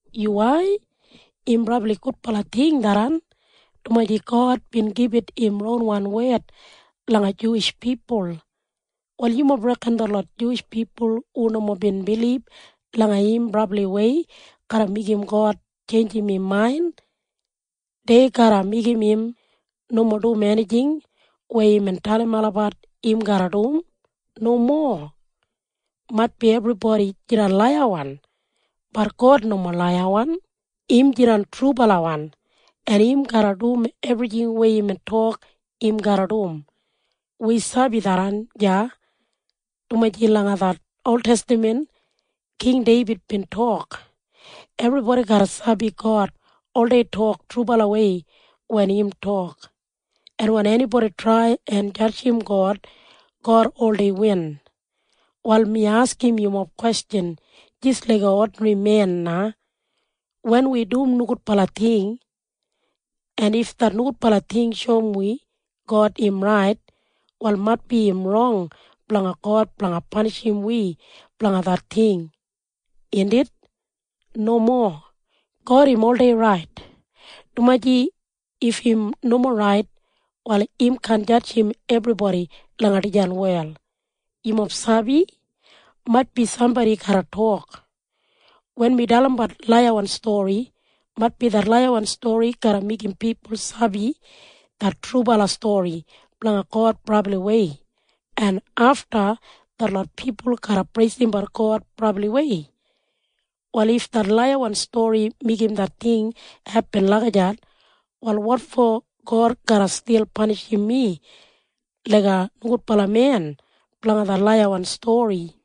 Yuwai. Im brabli gudbala ting tharran, dumaji God bin gibit im ronwan wed langa Juwish pipul. En wanim yumob reken? Detlot Juwish pipul hu nomo bin bilib langa im brabliwei garra meigim God tjeinjim im main? Dei garra meigim im nomo dum enijing weya imbin dalim olabat im garra dum? Nomo. Maitbi ebribodi jidan laiyawan. Bat God nomo laiyawan. Im jidan trubalawan, en im garra dum ebrijing weya imbin tok im garra dum. Wi sabi tharran deya, dumaji langa det oltestaman King Deibid bin tok, “Ebribodi garra sabi God oldei tok trubalawei wen im tok. En wen enibodi trai en jadjim God, God oldei win.” Wal mi askim yumob kwestjan jis laiga odinri men na. Wen wi dum nogudbala ting, en if det nogudbala ting shoum wi God im rait, wal maitbi im rong blanga God blanga panishim wi blanga det ting, indit? Nomo. God im oldei rait, dumaji if im nomo rait, wal im kaan jadjim ebribodi langa dijan wel. Yumob sabi? Maitbi sambodi garra tok, “Wen mi dalimbat laiyawan stori, maitbi det laiyawan stori garra meigim pipul sabi det trubala stori blanga God brabliwei, en afta detlot pipul garra preisimbat God brabliwei. Wal if det laiyawan stori meigim det ting hepin lagijat, wal wotfo God garra stil panishim mi laiga nogudbala men blanga det laiyawan stori?”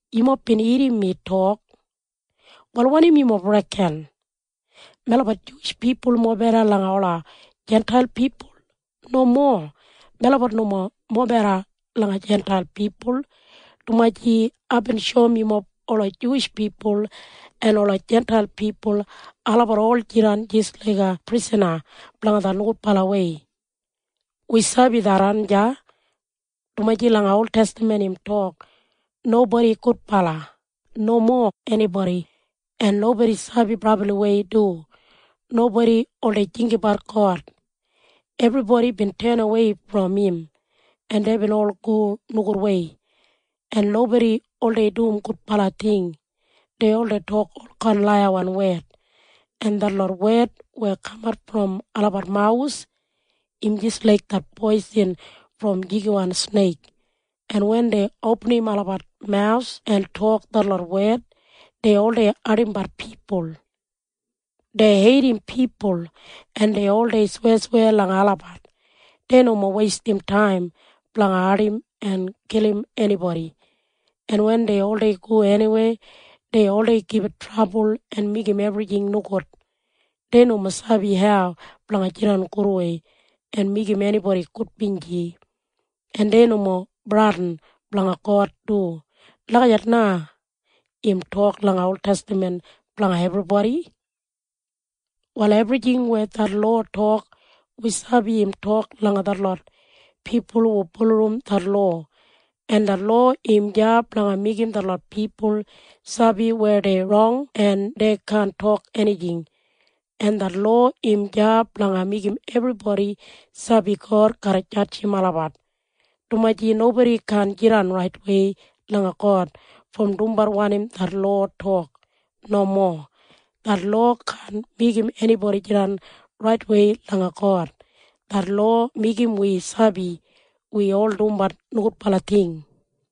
Yumob bin irrim mi tok. Wal wanim yumob reken? Melabat Juwish pipul mobeda langa ola Jintail pipul? Nomo. Melabat nomo mobeda langa Jintail pipul, dumaji aibin shoum yumob ola Juwish pipul en ola Jintail pipul olabat ol jidan jis laiga prisana blanga det nogudbalawei. Wi sabi tharran deya, dumaji langa oltestaman im tok, “Nobodi gudbala. Nomo enibodi. En nobodi sabi brabliwei du. Nobodi oldei jinggabat God. Ebribodi bin tenawei brom im, en deibin ol go nogudwei, en nobodi oldei dum gudbala ting. Dei oldei tok olkain laiyawan wed, en detlot wed weya kamat brom olabat mawus im jis laik det poisin brom jigiwan sneik, en wen dei opinim olabat mawus en tok detlot wed, dei oldei ardimbat pipul. Dei heidim pipul, en dei oldei sweyasweya langa olabat. Dei nomo weistim taim blanga ardim en kilim enibodi, en wen dei oldei go eniweya, dei oldei gibit trabul en meigim ebrijing nogud. Dei nomo sabi hau blanga jidan gudwei en meigim enibodi gudbinji, en dei nomo bradin blanga God du.” Lagijat na im tok langa oltestaman blanga ebribodi. Wal ebrijing weya det lowa tok, wi sabi im tok langa detlot pipul hu bulurrum det lowa, en det lowa im deya blanga meigim detlot pipul sabi weya dei rong en dei kaan tok enijing, en det lowa im deya blanga meigim ebribodi sabi God garra jadjim olabat, dumaji nobodi kaan jidan raitwei langa God brom dumbat wanim det lowa tok. Nomo. Det lowa kaan meigim enibodi jidan raitwei langa God. Det lowa meigim wi sabi wi ol dumbat nogudbala ting.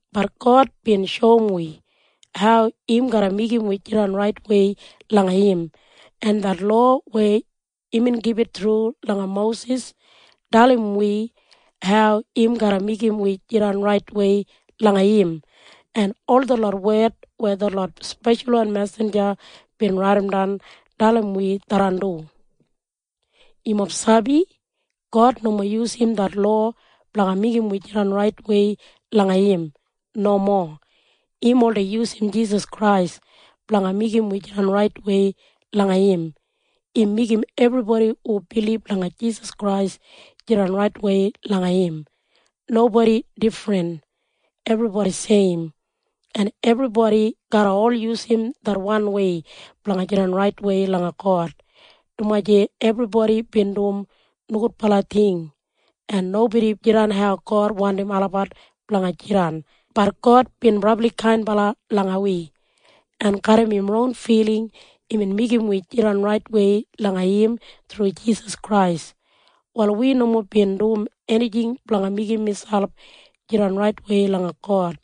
Bat God bin shoum wi hau im garra meigim wi jidan raitwei langa im. En det lowa weya imbin gibit thru langa Mosis dalim wi hau im garra meigim wi jidan raitwei langa im, en ol detlot wed weya detlot speshalwan mesinja bin raidimdan dalim wi tharran du. Yumob sabi? God nomo yusum det lowa blanga meigim wi jidan raitwei langa im. Nomo. Im oldei yusum Jisas Krais blanga meigim wi jidan raitwei langa im. Im meigim ebribodi hu bilib langa Jisas Krais jidan raitwei langa im. Nobodi difrin. Ebribodi seim. En ebribodi garra ol yusum det wanwei blanga jidan raitwei langa God, dumaji ebribodi bin dum nogudbala ting, en nobodi jidan hau God wandim olabat blanga jidan. Bat God bin brabli kainbala langa wi, en garram im ron filing imbin meigim wi jidan raitwei langa im thru Jisas Krais. Wal wi nomo bin dum enijing blanga meigim miselp jidan raitwei langa God.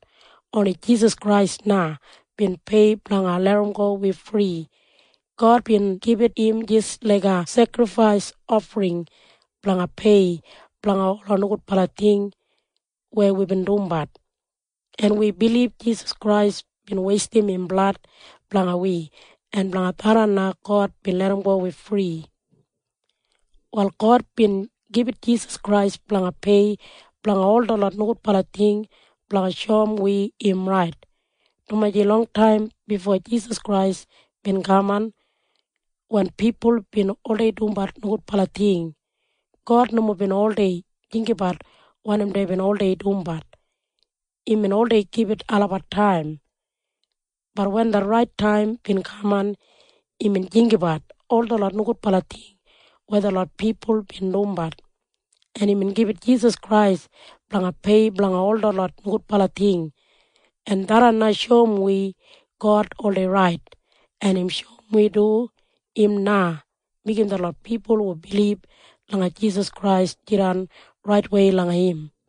Oni Jisas Krais na bin pei blanga larramgo wi fri. God bin gibit im jis laiga sekrifais ofring blanga pei blanga ola nogudbala ting weya wibin dumbat, en wi bilib Jisas Krais bin weistim im blad blanga wi en blanga tharran na God bin larramgo wi fri. Wal God bin gibit Jisas Krais blanga pei blanga ol detlot nogudbala ting blanga shoum wi im rait, dumaji longtaim bifo Jisas Krais bin kaman, wen pipul bin oldei dumbat nogudbala ting, God nomo bin oldei jinggabat wanim deibin oldei dumbat. Imbin oldei gibit olabat taim. Bat wen det rait taim bin kaman, imbin jinggabat ol detlot nogudbala ting weya detlot pipul bin dumbat, en imbin gibit Jisas Krais blanga pei blanga ol detlot nogudbala ting, en tharran na shoum wi God oldei rait, en im shoum wi du im na meigim detlot pipul hu bilib langa Jisas Krais jidan raitwei langa im.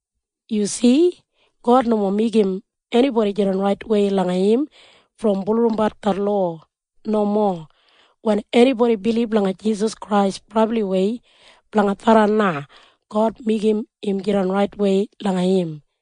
Yumob sabi? God nomo meigim enibodi jidan raitwei langa im brom bulurrumbat det lowa. Nomo. Wen enibodi bilib langa Jisas Krais brabliwei, blanga tharran na God meigim im jidan raitwei langa im.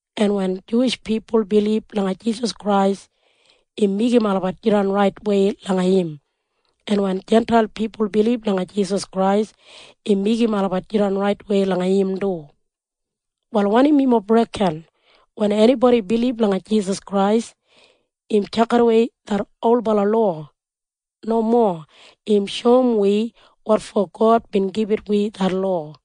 En wen Juwish pipul bilib langa Jisas Krais, im meigim olabat jidan raitwei langa im. En wen Jintail pipul bilib langa Jisas Krais, im meigim olabat jidan raitwei langa im du. Wal wanim yumob reken? Wen enibodi bilib langa Jisas Krais, im tjakidawei det olbala lowa? Nomo. Im shoum wi wotfo God bin gibit wi det lowa.